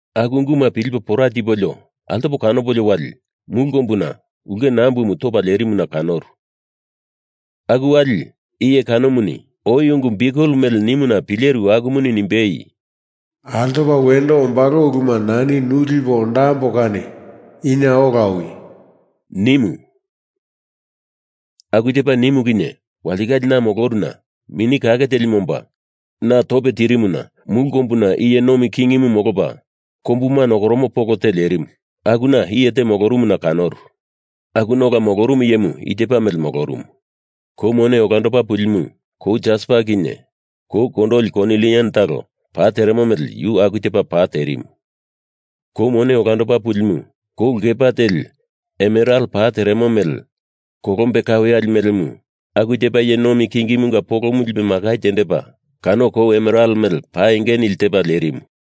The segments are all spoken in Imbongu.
Aku unguma pilipo pora tipolio altopa kanopolio wali mulu kombuna ulke nambumu topa lerimuna kanoru. Aku wali iye kanomuni oi ungu biukel mele nimuna pileru akumuni nimbei, “Altopa wendo ombalo uluma nani nu lipo ondambo kani ina ola owi!” nimu. Aku tepa nimu kinye walitikale na moloruna Mini Kake Telimu omba na tope tirimuna mulu kombuna iye nomi kingimu molopa kombuma nokoromo polo te lerimu, akuna iye te molorumuna kanoru. Akuna ola molorumu iyemu i tepa mele molorumu. Kou mone olandopa pulimu kou jaspa kinye kou kondoli konilian talo pa teremo mele yu aku tepa pa terimu. Kou mone olandopa pulimu kou lkepa teli emeral pa teremo mele kolombe kaweyali melemu aku tepa iye nomi kingimunga polomu lipe makai tendepa kano kou emeral mele pa enge nili tepa lerimu.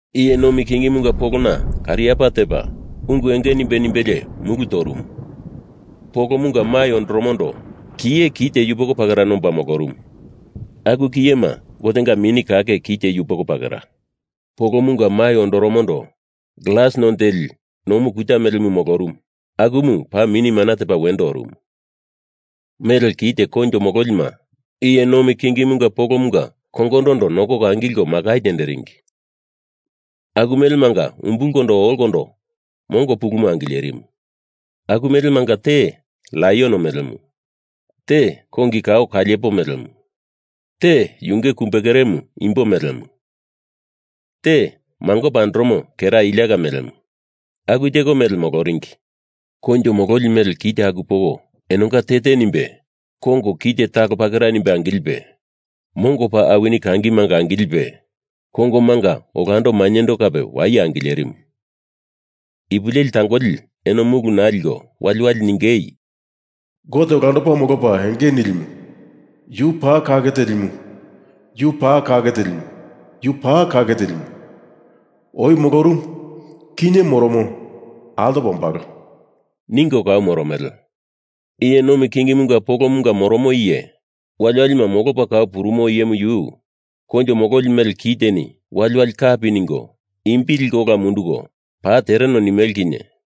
Iye nomi kingimunga polona kariapa tepa, ungu enge nimbe nimbelie mulu torumu. Polomunga mai ondoromondo kiye kite yupoko pakera nomba molorumu, aku kiyema Gotenga Mini Kake kite yupoko pakera. Polomunga mai ondoromondo glas none teli nomu kuta melemu molorumu akumu paa mini mana tepa wendo orumu. Mele kite koinjo mololima iye nomi kingimunga polomunga kongondondo nondoko angilko makai tenderingi. Aku melemanga umbulkondo olokondo mongo pulumu angilerimu. Aku melemanga te laion melemu, te kongi kao kaliepo melemu, te yunge kumbe keremu imbo melemu, te mangopa andoromo kera iliaka melemu aku teko mele moloringi. Koinjo mololi mele kite aku poko enonga te te nimbe kongo kite talo pakera nimbe angilipe mongo paa awini kangimanga angilipe, kongomanga olando mainyendo kape waye angilerimu. Ipu leli tangoli eno mulu naa liko wali wali ningei, “Gote Olandopa Molopa Enge Nilimu yu paa kake telimu, yu paa kake telimu, yu paa kake telimu. Oi molorumu, kinye moromo, altopa ombalo,” ningo kau moromele. Iye nomi kingimunga polomunga moromo iye, wali walima molopa kau purumo iyemu yu koinjo mololi mele kiteni wali wali kapi ningo imbi liko ola mundunko paa tereno nimele kinye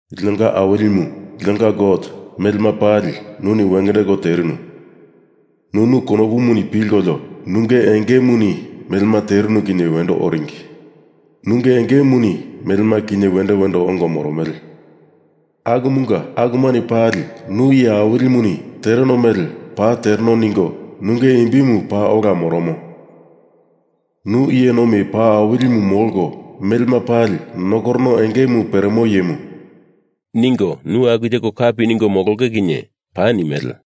“Linonga Awilimu, linonga Gote, melema pali nuni wengendeko terinu. Nunu konopuni pilkolio nunge engemuni melema terinu kinye wendo oringi, nunge engemuni melema kinye wendo wendo ongo moromele, akumunga akumani pali Nu Iye Awilimuni tereno mele paa tereno ningo Nunge imbimu paa ola moromo. Nu iye nomi paa awilimu molko melema pali nokorono engemu peremo iyemu,” ningo nu aku teko kapi ningo molonge kinye paa nimele.